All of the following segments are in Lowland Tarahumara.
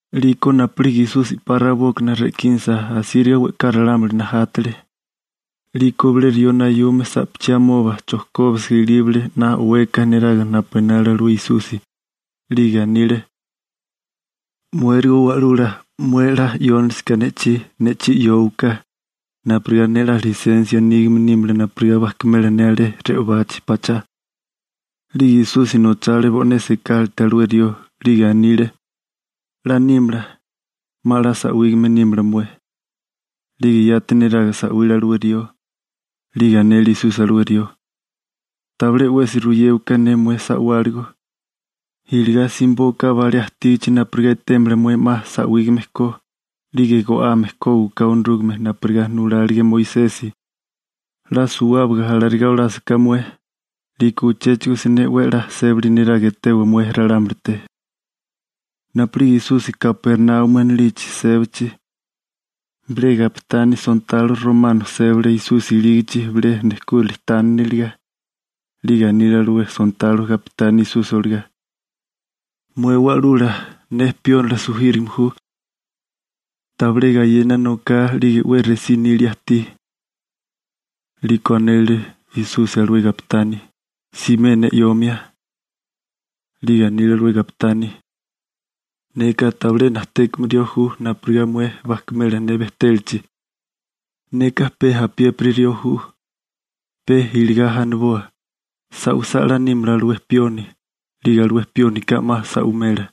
'Liko napu'lige Esusi 'pa rabókana re'kínasa asíriga we'ká ralámuli najátale. 'Liko bilé rió nayume sa'pachí amoba chojkóbisiga ilíbale 'na o'weka neraga napu enale alué Esusi. 'Lige anile: ―Muérigo Wa'lula, mué 'la 'yónalisiká ne'chí, ne'chí 'yówaká napurigá ne 'la lisensia nígame nímala napurigá bajkimela ne alé re'obachi pachá. 'Lige Esusi nochale bo'né sekálate alué rió, 'lige anile: ―'La nímala, 'ma 'la sa'wígame nímala mué. 'Lige yati neraga sa'wile alué rió. 'Lige anele Esusi alué rió: ―Tabilé 'wesi ruyéwaká ne mué sa'wáligo. Iligá simibóká balé ajtígichi napurigá etémala mué 'ma sa'wígame ko. 'Lige go'ame kógiwaká Onorúgame napurigá nulálige Moisesi. 'La suwábaga alarigá olásaká mué, 'liko uchéchigo siné 'we a'lá sébali niraga etewa mué ralámulite. Napu'lige Esusi Kapernaumi anilichi sébachi, bilé gapitani sontalo romano sébale Esusi ilígichi bilé nejkúrali tániniliga. 'Lige anile alué sontalo gapitani Esusi olagá: ―Mué Wa'lula, ne piónila sujírigame ju, tabilé gayena noká 'lige 'we resí nilia ajtí. 'Liko anele Esusi alué gapitani: ―Simé ne 'yomia. 'Lige anile alué gapitani: ―Neka tabilé najtékame rió ju napurigá mué bajkimela ne bejtélachi, neka pe apiépiri rió ju. Pe iligá aniboa: «Sa'wisá 'la nímala alué pioni», 'lige alué piónika 'ma sa'wimela,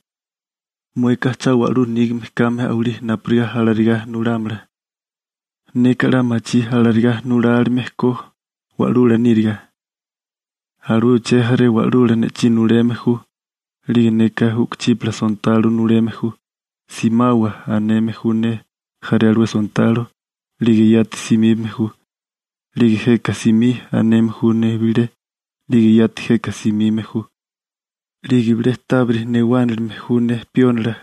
mueka cha wa'lú nígame kame a'walí napurigá alarigá nulámala. Neka 'la machí alarigá nulálime ko wa'lula níriga. Alué uché jaré wa'lula ne'chí nuleme ju, 'lige neka u'kuchípala sontalo nuleme ju. «Simawa», aneme ju ne jaré alué sontalo, 'lige yati simíbame ju. 'Lige «Jeka simí», aneme ju ne bilé, 'lige yati jeka simime ju. 'Lige bilé tábiri newánilime ju ne piónila,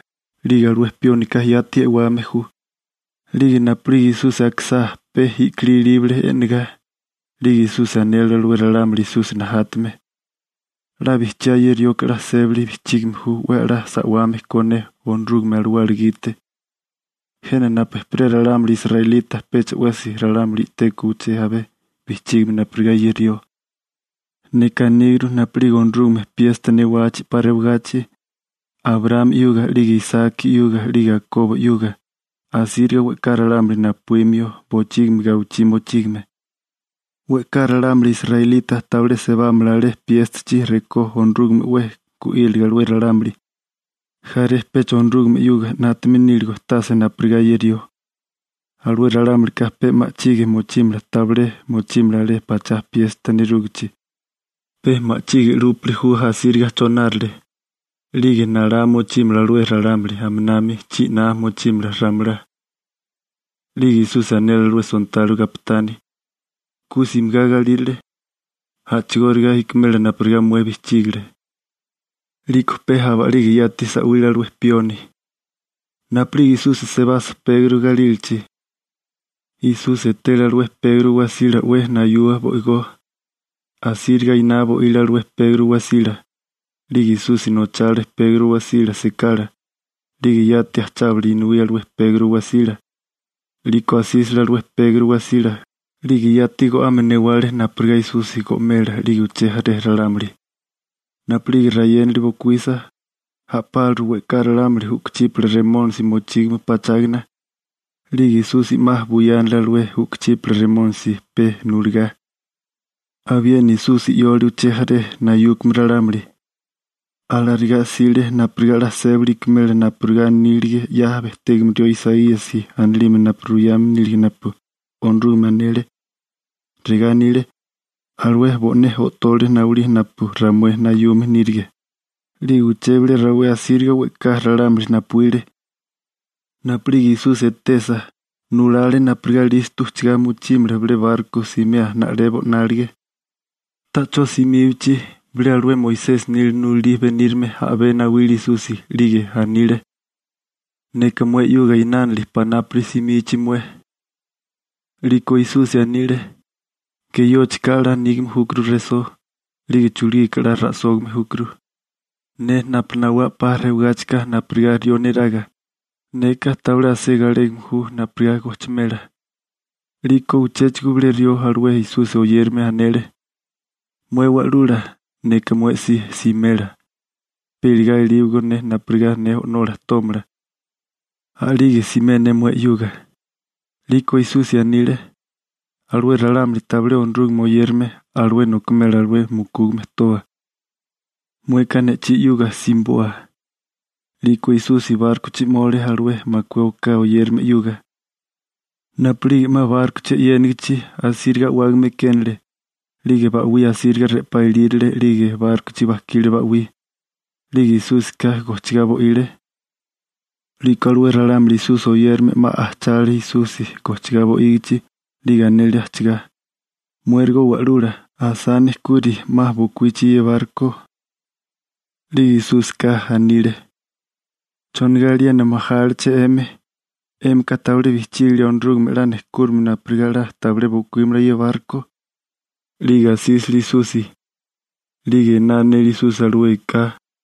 'lige alué piónika yati e'wame ju. 'Lige napu'lige Esusi akisá, pe i'kilí ilíbale e'negá. 'Lige Esusi anele alué ralámuli Esusi najátame: ―'La bijchiá ye rioka 'la sébali bijchígame ju 'we a'lá sa'wame ko ne Onorúgame Alawala gite. Jena napu ejperé ralámuli israelita pecha 'wesi ralámuli i'tékó uché abé bijchígame napurigá ye rió. Neka aníguru napu'lige Onorúgame piesta newachi 'pa rewagachi Abraámi 'yuga 'lige Isaki 'yuga 'lige Akobo 'yuga, asíriga we'ká ralámuli napuímio bochígimi gawichí mochígame. We'ká ralámuli israelita tabilé sebámala alé piéstachi rekó Onorúgameka 'we gu'írilige alué ralámuli, jaré pecha Onorúgame 'yuga 'nátame níligo tase napurigá ye rió. Alué ralámulika pe ma'chige mochímala tabilé mochímala alé pachá piesta nerúgichi. Pe ma'chige 'lúpili ju asíriga chonárale. 'Lige nalá mochímala alué ralámuli aminami chi'ná mochímala ramelá. 'Lige Esusi anele alué sontalo gapitani: ―Ku simigá galírale. A'chigóriga ikimela napurigá mué bijchígale. 'Liko pe aba'lige yati sa'wile alué pioni. Napu'lige Esusi sebasa Pegro galílachi, Esusi etele alué Pegro wasila 'we nayua bo'igó. Asíriga iná bo'ile alué Pegro wasila. 'Lige Esusi nochale Pegro wasila sekala, 'lige yati ajchábale inuí alué Pegro wasila. 'Liko asísale alué Pegro wasila, 'lige yati go'ame newale napurigá Esusi go'mela 'lige uché jaré ralámuli. Napu'lige rayénali bokuísa, a'páliru we'ká ralámuli u'kuchípala remónisi mochígame pachágana. 'Lige Esusi 'ma buyánale alué u'kuchípala remónisi pe nuligá. Abiena Esusi 'yole uché jaré nayúkame ralámuli. Alarigá 'sile napurigá 'la sébali ikimela napurigá anílige 'ya bejtégame rió Isaíasi anilime napu ruyame nílige napu Onorúgame anele. Regá anile: «Alué bo'né o'tole nawilí napu ramué nayume nírige.» 'Lige uché bilé rawé asíriga we'ká ralámuli napuíle. Napu'lige Esusi etesa, nulale napurigá listo ujchagá mochímala bilé barko simea na'lebo 'nálige. Ta'chó simíbachi, bilé alué Moisesi nila nulalí benírame a'bé nawile Esusi, 'lige anile: ―Neka mué 'yuga inánili panápuri simichi mué. 'Liko Esusi anile: ―Geyóchika 'la nígame júkuru resó, 'lige chulugika 'la ra'sógame júkuru. Ne napu nawá 'pa rewagáchika napurigá rió neraga, neka tabilé asé galégame ju napurigá gojchimela. 'Liko uchéchigo bilé rió alué Esusi oyérame, anele: ―Mué Wa'lula, neka mué si simela, pe iligá elíwagó ne napurigá ne o'nola tómala, a'lige simé ne mué 'yuga. 'Liko Esusi anile: ―Alué ralámuli tabilé Onorúgame oyérame, alué nokimela alué mukúgame toa. Mueka ne'chí 'yuga simiboa. 'Liko Esusi bárkochi 'mole alué makué oká oyérame 'yuga. Napu'lige 'ma bárkochi e'yénigichi, asíriga a'wágame ekénale, 'lige ba'wí asíriga re'pá ilírale 'lige bárkochi bajkile ba'wí. 'Lige Esúsika gojchigá bo'ile. 'Liko alué ralámuli Esusi oyérame 'ma ajchale Esusi gojchigá bo'ígichi. 'Lige anele ajchigá: ―¡Muérigo Wa'lula, asá nejkuri, 'ma bokuíchi ye barko! 'Lige Esúsika anile: ―¿Chonigá aliena majáliché 'emi? 'Émika tabilé bijchígilia Onorúgame 'la nejkúrimio napurigá 'la tabilé bokuímala ye barko. 'Lige asísale Esusi, 'lige ená anele Esusi alué eká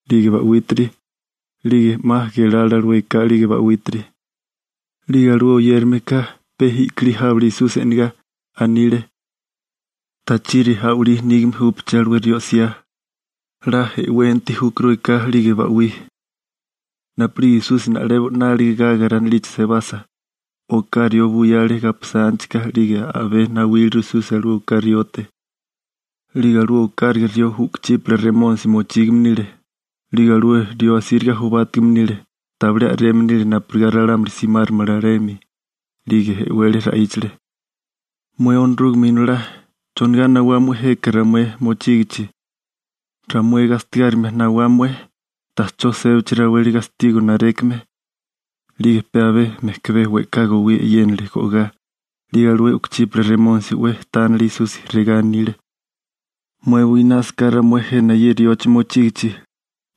'lige ba'wítiri. 'Lige 'ma gelale alué eká 'lige ba'wítiri. 'Lige alué oyérameka pe i'kilí jábele Esusi e'negá. 'Lige regá anile: ―¿Tachiri a'walí nígame júpeché alué rió 'siá? 'La e'wenti júkuru eká 'lige ba'wí. Napu'lige Esusi na'lebo 'nálige Garara anilichi sebasa, oká rió buyale gaposántichika. 'Lige a'bé nawíleru Esusi alué oká riote. 'Lige alué okáraga rió u'kuchípala remónisi mochígame nile, 'lige alué rió asíriga jobátigame nile, tabilé a'reme nile napurigá ralámuli simáramala alemi. 'Lige e'wele ra'íchale: ―Mué Onorúgame Inolá, ¿chonigá nawá mué jeka ramué mochígichi? ¿Ramué gastigárimia nawá mué? Ta'chó sébachi raweli gastigo narékime. 'Lige pe abé mejkabé we'ká gowí e'yénale go'gá. 'Lige alué u'kuchípala remónisi 'we tánele Esusi, regá anile: ―Mué buinásaká ramué jena ye riochi mochígichi,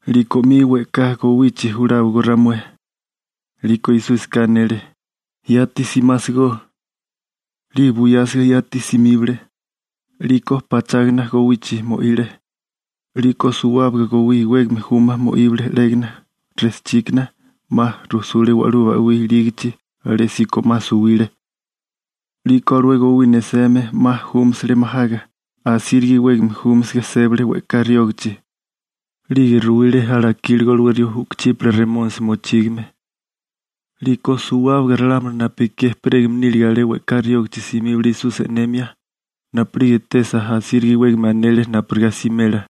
'liko 'mi we'ká gowichi juláwagó ramué. 'Liko Esúsika anele: ―¡Yati simásigó! 'Lige buyásiga yati simíbale, 'liko pachágana gowichi mo'ile, 'liko suwábaga gowí iwégame juma mo'íbele 'légana rejchíkana. 'Ma rujsule wa'lú ba'wí ilígichi, alésíko 'ma suwile. 'Liko alué gowí neseme, 'ma júmasale majaga, asíriga iwégame júmasaga sébale we'ká riógichi. 'Lige ruwile alakíligo alué rió u'kuchípala remónisi mochígame. 'Liko suwábaga ralámuli napu ekí ejperégame nílige alé we'ká riógichi simíbale Esusi e'nemia. Napu'lige etesa, asíriga iwégame anele napurigá simela.